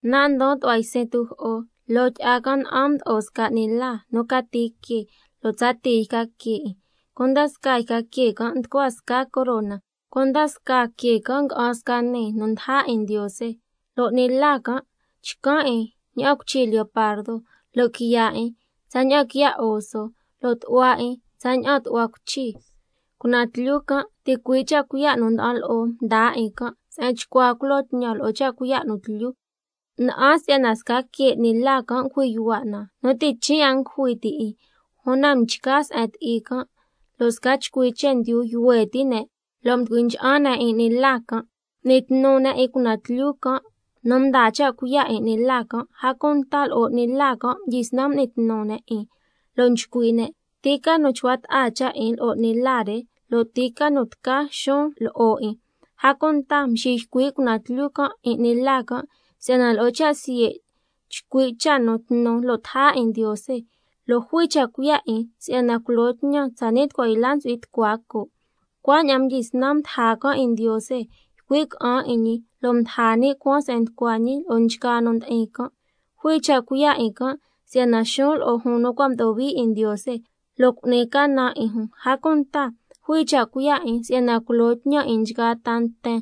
Nan' ndon tu'hua ysin tujo'o, loo tyi'a can' na'an mdo'o sca 'ni la nu cati que lo' tsa tii yca que 'in, cunda scaa yca que can' nducua scaa corona, cunda scaa que can' nga'an sca nii nu ndaja 'in Ndiose. Lo' 'ni la can' chcan' 'in ña'an cuichi leopardo, lo' quiya' 'in tsaña'an quiya' oso, lo' tu'hua 'in tsaña'an tu'hua cuichi. Cunaan tlyu can' ticui' cha' cuiya' nu nda'an lo'o mdaa 'in can', se'en chcua culo tñan lo'o cha' cuiya' nu tlyu. Na'an si'yana sca que 'ni la can' ngujui yuhua' na nu ti' chin' a ngujui ti 'in, una mchca se'en ti'i can', lo' sca chcui chendyu yuhue ti' ne' lo' mducui ncha'an ne' 'in 'ni la can'. M'ni tnu ne' 'in cunaan tlyu can' nu mdaa cha' cuiya' 'in 'ni la can', a cunta lo'o 'ni la can' mdyisnan m'ni tnu ne' 'in, lo' nchcui' ne': ¿Ti ca nu chcua ta'a cha' 'in lo'o 'ni la re, lo' ti ca nu tca xuun lo'o 'in? A cunta mxiycui' cunaan tlyu can' 'in 'ni la can' si'yana lo'o cha' siye' chcui' cha' nu tnu lo' taja 'in Ndiose, lo' jui cha' cuiya' 'in si'yana culo tñan tsani' tucua yla ntsu'hui tucua coo'. Cuaña'an mdyisnan mdaja can' 'in Ndiose, ycui' ca'an 'in ñi lo' mdaja ni' cuaan se'en nducua ñi lo'o nchgaa nu ndi'in can'. Jui cha' cuiya' 'in can' si'yana xuun lo'o jun nu cua' mdo'o hui 'in Ndiose, lo' cu'ni canan 'in jun. A cunta jui cha' cuiya' 'in si'yana culo tñan 'in nchgaa ta nten,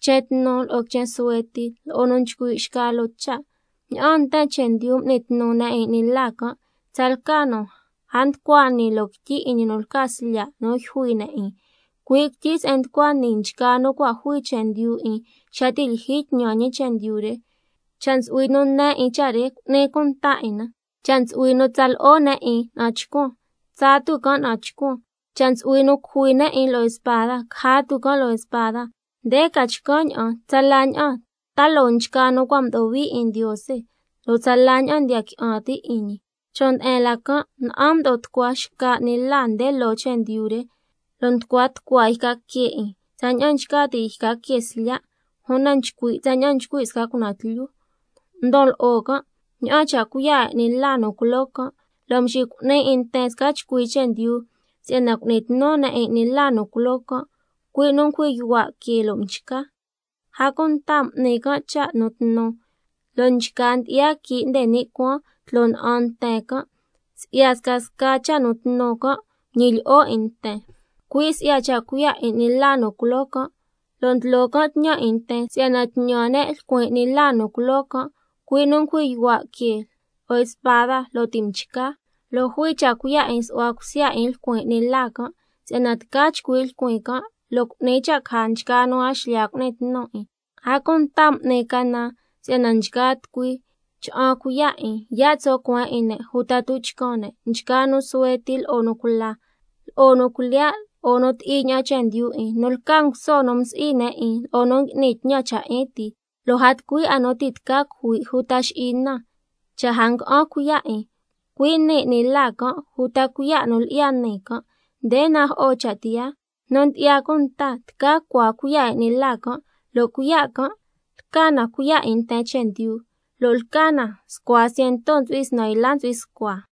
quichen tnu lo'o quichen suhue ti, lo'o nu nchcui' xca loo cha'. Ña'aan nten chendyu m'ni tnu ne' 'in 'ni la can', tsalca nu a nducua nii loo quityi 'in ñi nu lca Slya' nu yjui ne' 'in, cui' quityi se'en nducua nii nchgaa nu cua' jui chendyu 'in xa ti' lyijyi tñan ñi chendyu re. Cha' ntsu'hui nu ne 'in cha' re, cu'ni cunta 'in na. —Cha' ntsu'hui nu tsa lo'o ne' 'in na'an chcuan, tsaa tu can' na'an chcuan, cha' ntsu'hui nu cujui ne' 'in lo'o spada, caja tu can' lo'o spada—. Nde ca chcan' ña'an tsala ña'an ta loo nchgaa nu cua' mdo'o hui 'in Ndiose, lo' tsala ña'an ndiya qui'an ti' 'in ñi. Chon' nde'en la can' na'an mdo'o tucua xca 'ni la nde loo chendyu re, lo' nducua tucua yca que 'in tsaña'an nchca ti' yca que slya', una nchcui' tsaña'an nchcui' sca cunaan tlyu. Ndon lo'o can' ña'aan cha' cuiya' 'in 'ni la nu culoo can', lo' nxicu'ni 'in nten sca chcui chendyu si'yana cu'ni tnu ne' 'in 'ni la nu culoo can', cui' nu ngujui yuhua' que lo' mchca. A cunta n'ni can' cha' nu tnu, lo' nchca ndyi'ya quii' nde ni' cuaan tloo na'an nten can'. Si'ya scasca cha' nu tnu can', ñilyi'o 'in nten, cui' si'ya cha' cuiya' 'in 'ni la nu culoo can', lo' ndlo can' tñan 'in nten si'yana tñan ne' lcuin 'ni la nu culoo can', cui' nu ngujui yuhua' que lo'o spada lo' ti' mchca. Lo' jui cha' cuiya' 'in su'hua cusya 'in lcuin 'ni la can', si'yana tca chcui' lcuin can' lo' cu'ni cha' caja nchgaa nu a xlya cu'ni tnu 'in. A cunta m'ni canan si'yana nchgaa tucui cha'an cuiya' 'in, yaa' tso' cueen 'in ne' uta tuchcan ne', nchgaa nu suhue ti lo'o nu cula, lo'o nu cuilyiya' lo'o nu ti'i ña'an chendyu 'in, nu lca nguso nu msi'i ne' 'in lo'o nu ngui'ni tñan cha' 'in ti. Lo' a tucui 'a nu ti' tca cujui' uta xi'i na, cha' a nga'an cuiya' 'in, cui' nii 'ni la can', uta cuiya' nu lyi'ya nii can'. Nde najo'o cha' tiyaa. Nu ndyi'ya cunta tca cua cuiya' 'in 'ni la can', lo' cuiya' can' lca na cuiya' 'in nten chendyu, lo' lca na scua ciento ntsu'hui snan yla ntsu'hui scua.